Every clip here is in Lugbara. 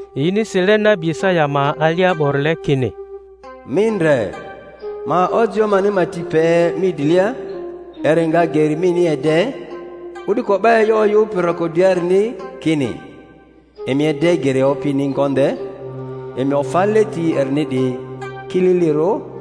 Yini sile nabi Isaya ma alia 'borile, kini, Mi ndre, ma ojio mani ma ti pe mi drilia, eri nga geri mini ede; o'duko 'ba e'yo oyᴜpi roko driarini, kini: Emi ede geri Opini ngonde, emi ofa leti erini 'diyi kililirᴜ—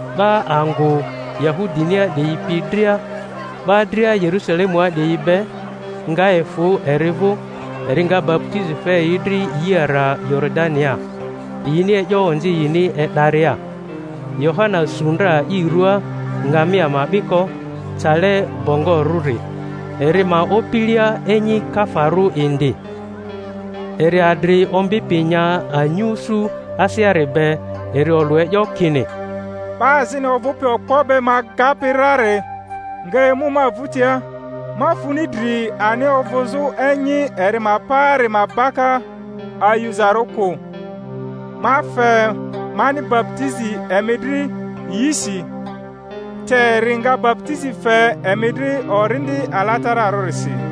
'Ba angᴜ Yahudinia 'diyi pi dria, 'ba dria Yerusalemua 'diyi be, nga efᴜ eri vᴜ; eri nga baputizi fe yi dri yi ara Yoridania, yini e'yo onzi yini e'daria. Yohana su ndra i ruaa ngamia ma 'biko cale bongorᴜri, eri ma opilia enyi kafarᴜ indi. Eri adri ombi pi nya anyusu aseari be. Eri olᴜ e'yo, kini, 'Ba azini ovᴜpi okpo be ma agapi rari nga emu ma vᴜtia, ma funi dri ani avuzᴜ enyi eri ma paari ma baka ayuzarᴜ kᴜ. Ma fe mani baputizi emi dri yisi; te eri nga baputizi fe emi dri Orindi Alatararᴜsi.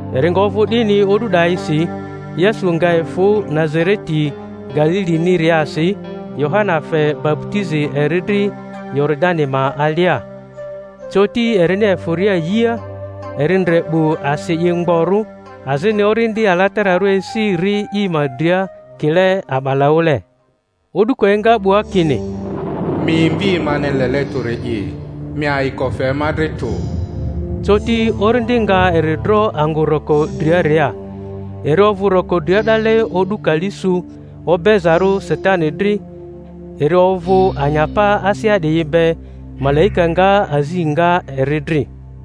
Eri nga ovᴜ 'dini o'du 'dayisi, Yesu nga efᴜ Nazareti Galiliniriasi, Yohana fe baputizi eri dri Yoridani ma alia. Coti erini efᴜria yia, eri ndre 'bu asi i mgborᴜ, azini Orindi Alatararᴜ esi ri i ma dria kile a'balaᴜle; o'duko enga 'bua, kini, Mi Mvi mani lele tᴜri'i, mi ayiko fe ma dri tᴜ. Coti Orindi nga eri dro angᴜ roko driaria. Eri ovᴜ roko dria 'dale o'du kali su, obezarᴜ Satani dri; eri ovᴜ anyapa asea 'diyi be; malaika nga azi nga eri dri.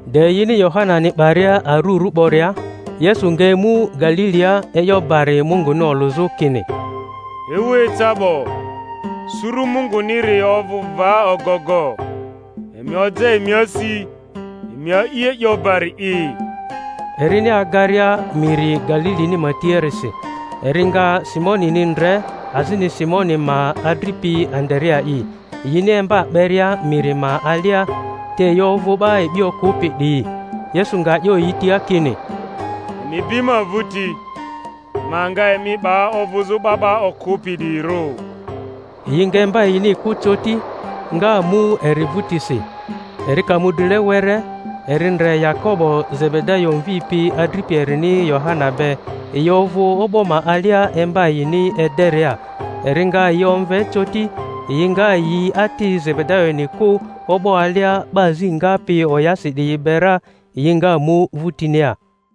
De yini Yohanani 'baria arurᴜ 'boria, Yesu nga emu Galilia, e'yo bari Munguni olᴜzᴜ kini, Ewu eca 'bo, suru Munguniri ovᴜ va ogogo; emi oja emi asi, emi a'i e'yo bari'i. Erini agaria miri Galilini ma tiarisi, eri nga Simonini ndre, azini Simoni ma adripi Andarea'i, yini emba 'beria miri ma alia; te yi ovᴜ 'ba e'bi okᴜpi 'diyi. Yesu nga 'yo yi tia kini, Emi bi ma vᴜti, ma nga emi 'ba ovᴜzᴜ 'ba 'ba okᴜpi 'diyirᴜ. Yi nga emba yini kᴜ coti, nga mu eri vᴜtisi. Eri ka mu drile were, eri ndre Yakobo Zebedayo mvi pi adripi erini Yohana be; yi ovᴜ o'bo ma alia emba yini ederia. Eri nga yi omve coti; yi nga yi ati Zebedayoni kᴜ o'bo alia 'ba azi ngapi oyasi 'diyi be ra, yi nga mu vᴜtinia.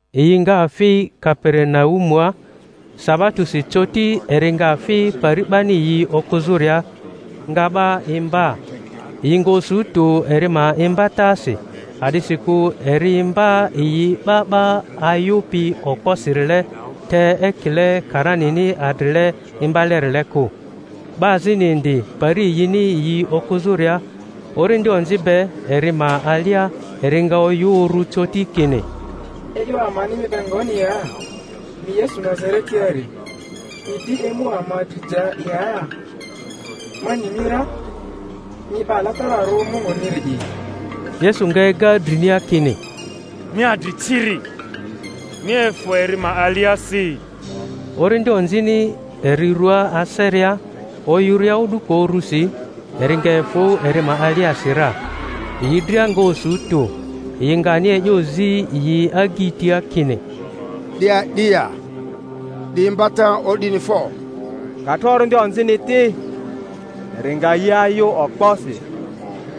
Yi nga fi Kaperinaumua; sabatosi coti eri nga fi pari 'bani yi okᴜzᴜria, nga 'ba imba. Yi nga osu tᴜ eri ma imbatasi, a'disikᴜ eri imba yi 'ba 'ba ayᴜpi okposirile, te ekile karanini adrile imbalerile kᴜ. 'Ba azini indi, pari yini yi okᴜzᴜria, orindi onzi be eri ma alia; eri nga oyᴜ uru coti kini, E'yo amani mi be ngoni ya? Mi Yesu Nazaretiari, mi di emu ama dri ja ya? Ma ni mi ra, mi 'Ba Alatararᴜ Munguniri'i! Yesu nga ega drinia, kini, Mi adri ciri, mi efᴜ eri ma aliasi! Orindi onzini eri rua aseria, oyᴜria o'duko urusi, eri nga efᴜ eri ma aliasi ra. Yi dria nga osu tᴜ, yi nga ani e'yo zi yi agyi tia kini, 'Di a'di ya? 'Di imbata o'dini fo! Ka tro orindi onzini ti, eri nga yi ayᴜ okposi,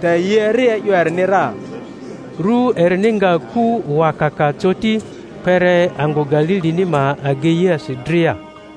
te yi eri e'yo erini ra. Ru erini nga ku wakaka coti, kpere angᴜ Galilini ma ageiasi dria.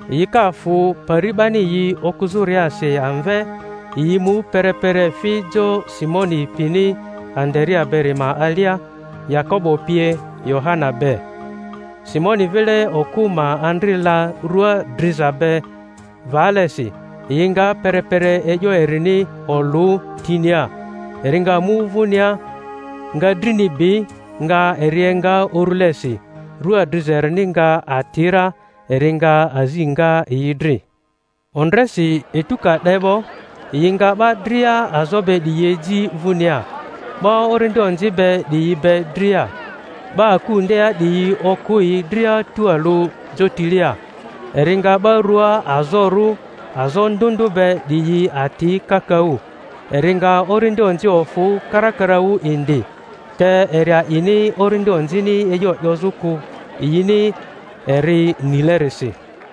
Yi ka fᴜ pari 'bani yi okᴜzᴜriasi amve, yi mu perepere fi jo Simoni pini Andarea beri ma alia, Yakobo pie Yohana be. Simoni vile okᴜ ma andri la rua driza be valesi; yi nga perepere e'yo erini olᴜ tinia. Eri nga mu vᴜnia, nga drini bi, nga eri enga urulesi; rᴜa driza erini nga ati ra, eri nga azi nga yi dri. Ondresi, etu ka 'de 'bo, yi nga 'ba dria azo be 'diyi eji vᴜnia, 'ba orindi onzi be 'diyi be dria. 'Ba akᴜ ndea 'diyi okᴜ yi dria tualᴜ jotilia. Eri nga 'ba rua azorᴜ azo ndᴜ ndᴜ be 'diyi ati kakaᴜ, eri nga orindi onzi ofᴜ karakaraᴜ indi; te eri a'ini orindi onzini e'yo 'yozᴜ kᴜ, yini eri nilerisi.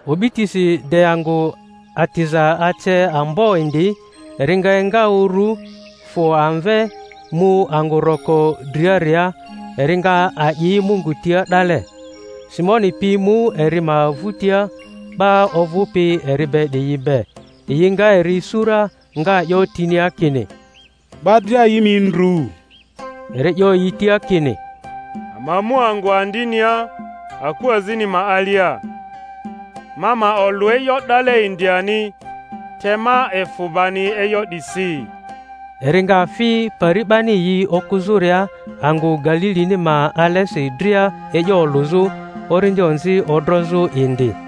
O'bitisi de angᴜ atiza ace ambo indi, eri nga enga urᴜ, fᴜ amve, mu angᴜ roko driaria, eri nga a’i Mungu tia 'dale. Simoni pi mu eri ma vᴜtia 'ba ovᴜpi eri be 'diyi be; yi nga eri isu ra, nga 'yo tinia kini, 'Ba dria yi mi ndru. Eri 'yo yi tia kini, Ama mu angᴜ andinia aku azini ma alia, ma ma olᴜ e'yo 'dale indi ani; te ma efᴜ bani e'yo 'disi. Eri nga fi pari 'bani yi okᴜzᴜria angᴜ Galilini ma alesi dria e'yo olᴜzᴜ, orindi onzi odrozᴜ indi.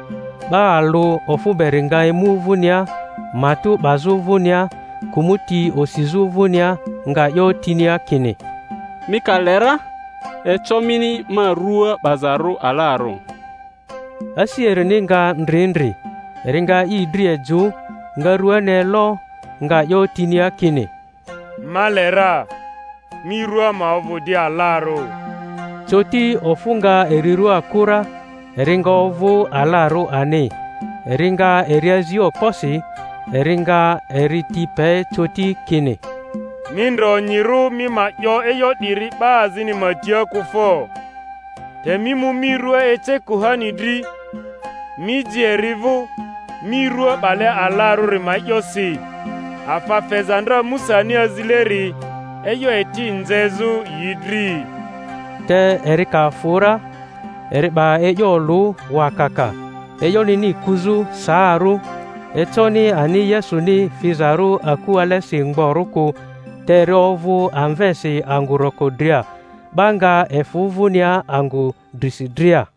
'Ba alᴜ ofᴜ beri nga emu vᴜnia matᴜ 'bazᴜ vᴜnia, kᴜmᴜti osizᴜ vᴜnia, nga 'yo tinia kini, Mi ka le ra, eco mini ma rᴜa 'bazarᴜ alarᴜ. Asi erini nga ndri ndri, eri nga i dri ejᴜ, nga ruani elo, nga 'yo tinia kini, Ma le ra; mi rua ma ovᴜ di alarᴜ. Coti ofᴜ nga eri rua kᴜ ra, eri nga ovᴜ alarᴜ ani. Eri nga eri azi okposi, eri nga eri ti pe coti, kini, Mi ndre onyirᴜ mi ma 'yo e'yo 'diri 'ba azini ma tia kᴜ fo! Te mi mu mi rᴜa ece kuhani dri, mi ji eri vᴜ, mi rᴜa 'bale alarᴜri ma e'yosi, afa feza ndra Musani azileri, e'yo eti nzezᴜ yi dri. Te eri ka fᴜ ra, eri 'ba e'yo olᴜ wakaka, e'yonini kuzᴜ saarᴜ; econi ani Yesuni fizarᴜ aku alesi mgborᴜ kᴜ, te eri ovᴜ amvesi angᴜ roko dria. 'Ba nga efᴜ vᴜnia angᴜ drisi dria.